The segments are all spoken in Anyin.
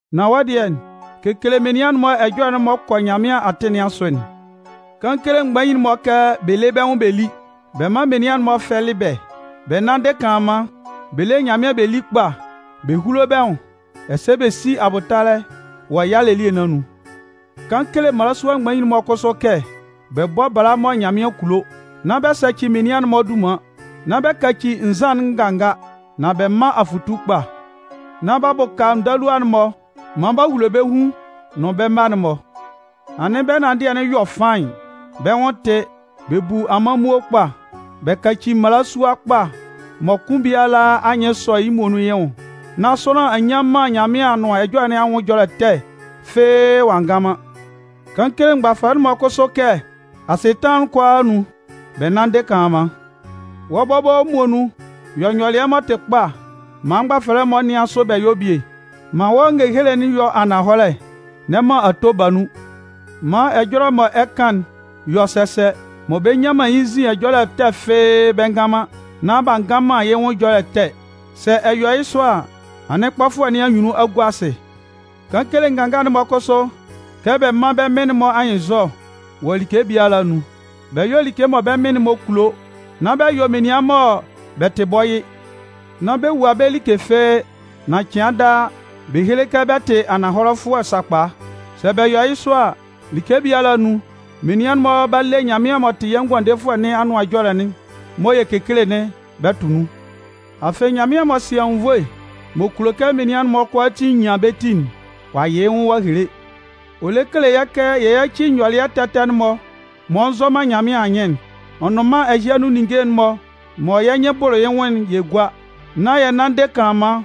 Nan wɔ́ dɩɛ, kekele menian'n-mɔ ɛjɔlɛ'n m'ɔ kɔ Nyanmɩan atɩn nɩn asʋ'n. Kan kele mgbanmgbain'n-mɔ kɛ bɛ lé bɛ́ nwʋn bɛ lí, bɛ mán menian'n-mɔ fɛ́lɩ bɛ́, bɛ nánndɩ kanlanman, bɛ lé Nyanmɩan bɛ lí kpa, bɛ húlo bɛ́ nwʋn ɛsɛ bɛ sí abʋtalɛ wɔ yalɛ elie nɩn anun. Kan kele mmalasua mgbanmgbain'n-mɔ kʋsʋ kɛ bɛ bɔ́ bala mɔ Nyanmɩan kulo. Nán bɛ sɛcɩ menian'n-mɔ dunman. Nán bɛ kaci nzan'n nganga. Nan bɛ mán afʋtu kpa, nán b'a bʋka ndalua'n-mɔ maan b'a hulo bɛ́ hun nʋn bɛ́ mma'n-mɔ. Anɩn bɛ́ ɛnanndɩɛ'n yɔ faɩn, bɛ́ nwʋn tɩ, bɛ bu awulo amanmuo kpa, bɛ kaci mmalasua kpa mɔ kʋn biala anyɩn sɔ yɩ́ muonun yɩ́ hun, nán sʋanlan a nnyan man Nyanmɩan Anʋan Ɛjɔlɛ nɩn anwʋn ɛjɔlɛ ɛtɛ fɩ́ɩ́ ɔ'a ngan man. Kan kele mgbafɛlɛ'n-mɔ kʋsʋ kɛ asɩtanlan'n kʋalaa anun, bɛ nánndɩ kanlanman. Wɔ́ bɔbɔ muonun yɔ nyɔlɩɛ m'ɔ tɩ kpa maan mgbafɛlɛ'n-mɔ nɩan sʋ bɛ yɔ́ bie. Man wɔ́ ngehele'n yɔ́ ananhɔlɛ, n'ɛ man ato ba nun. Man ɛjɔlɛ mɔ ɛ kan'n yɔ́ sɛsɛ, mɔ bɛ nnyan man yɩ́ nzin ɛjɔlɛ ɛtɛ fɩ́ɩ́ bɛ ngan man, nán b'a ngan man yɛ́ nwʋn ɛjɔlɛ ɛtɛ. Sɛ ɛ yɔ yɩ́ sɔ a, anɩn kpɔfʋɛ nɩn anyunnun a gua asɩ. Kan kele nganga'n-mɔ kʋsʋ kɛ bɛ mán bɛ́ mɩn-mɔ anyɩnnzɔ wɔ like biala anun. Bɛ yɔ́ like mɔ bɛ́ mɩn-mɔ kulo. Nán bɛ yɔ menian mɔ bɛ tɩ bɔyɩ, nán bɛ wua bɛ́ like fɩ́ɩ́. Nan cɩan daa, bɛ héle kɛ bɛ tɩ ananhɔlɛfʋɛ sakpa. Sɛ bɛ yɔ yɩ́ sɔ a, like biala anun, menian'n-mɔ 'ba le Nyanmɩan m'ɔ tɩ yɛ́ Ngʋandefʋɛ nɩn Anʋan Ɛjɔlɛ'n mɔ yɛ kekele'n bɛ tʋ nun. Afɩ, Nyanmɩan m'ɔ sɩ anwunnvoe m'ɔ kulo kɛ kulo menian'n-mɔ kʋalaatin nyan bɛ́ ti'n, ɔ'a yɩ yɩ́ nwʋn ɔ'a hele. Ɔ lɛ kele yɛ́ kɛ yɛ yáci nyɔlɩɛ ɛtɛ ɛtɛ'n-mɔ m'ɔ nzɔ man Nyanmɩan anyɩn'n, ɔ nʋn mân ɛhɩ anun ninnge'n-mɔ mɔ yɛ́ nyɩn bʋlʋ yɩ́ nwʋn'n yɛ gúa. Nán yɛ nánndɩ kanlanman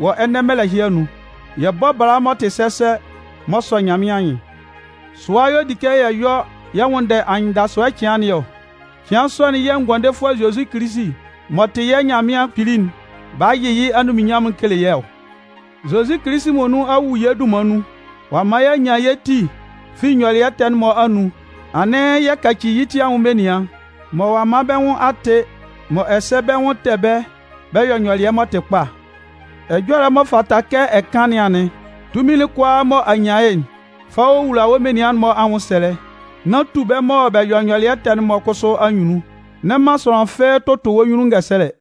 wɔ ɛnɛ mɛlɛ ɛhɩ anun, yɛ bɔ́ bala m'ɔ tɩ sɛsɛ m'ɔ sɔ Nyanmɩan anyɩn. Sʋa y'ɔ di kɛ yɛ yɔ yɛ nwʋnndɛ anyɩndasʋɛ cɩan nɩn ɔ. Cɩan sɔ'n yɛ̂ Ngʋandefʋɛ Zozi Kilisi m'ɔ tɩ yɛ́ Nyanmɩan Kpili'n 'ba yɩ yɩ́ anunminnyanmʋn kele yɛ́ ɔ. Zozi Kilisi muonun a wu yɛ́ dunman nun, ɔ'a man y'a nyan yɛ́ ti fi nyɔlɩɛ ɛtɛ'n-mɔ anun, anɩn yɛ kaci yɩ́ ti anwʋn menian mɔ ɔ'a man bɛ́ nwʋn a tɩ mɔ ɛsɛ bɛ́ nwʋn tɛ bɛ́ bɛ yɔ nyɔlɩɛ m'ɔ tɩ kpa. Ɛjɔlɛ m'ɔ fata mɔ ɛ kan nɩn anɩn. Tunmin'n kʋalaa mɔ a nyan yɩ́'n, fa wowula wɔ́ menian'n-mɔ anwʋnsɛlɛ, nán tu bɛ́ mɔ bɛ yɔ nyɔlɩɛ ɛtɛ'n-mɔ kʋsʋ anyunnun. N'ɛ man sʋanlan fɩ́ɩ́ tʋtʋ wɔ́ nyunnun ngɛsɛlɛ.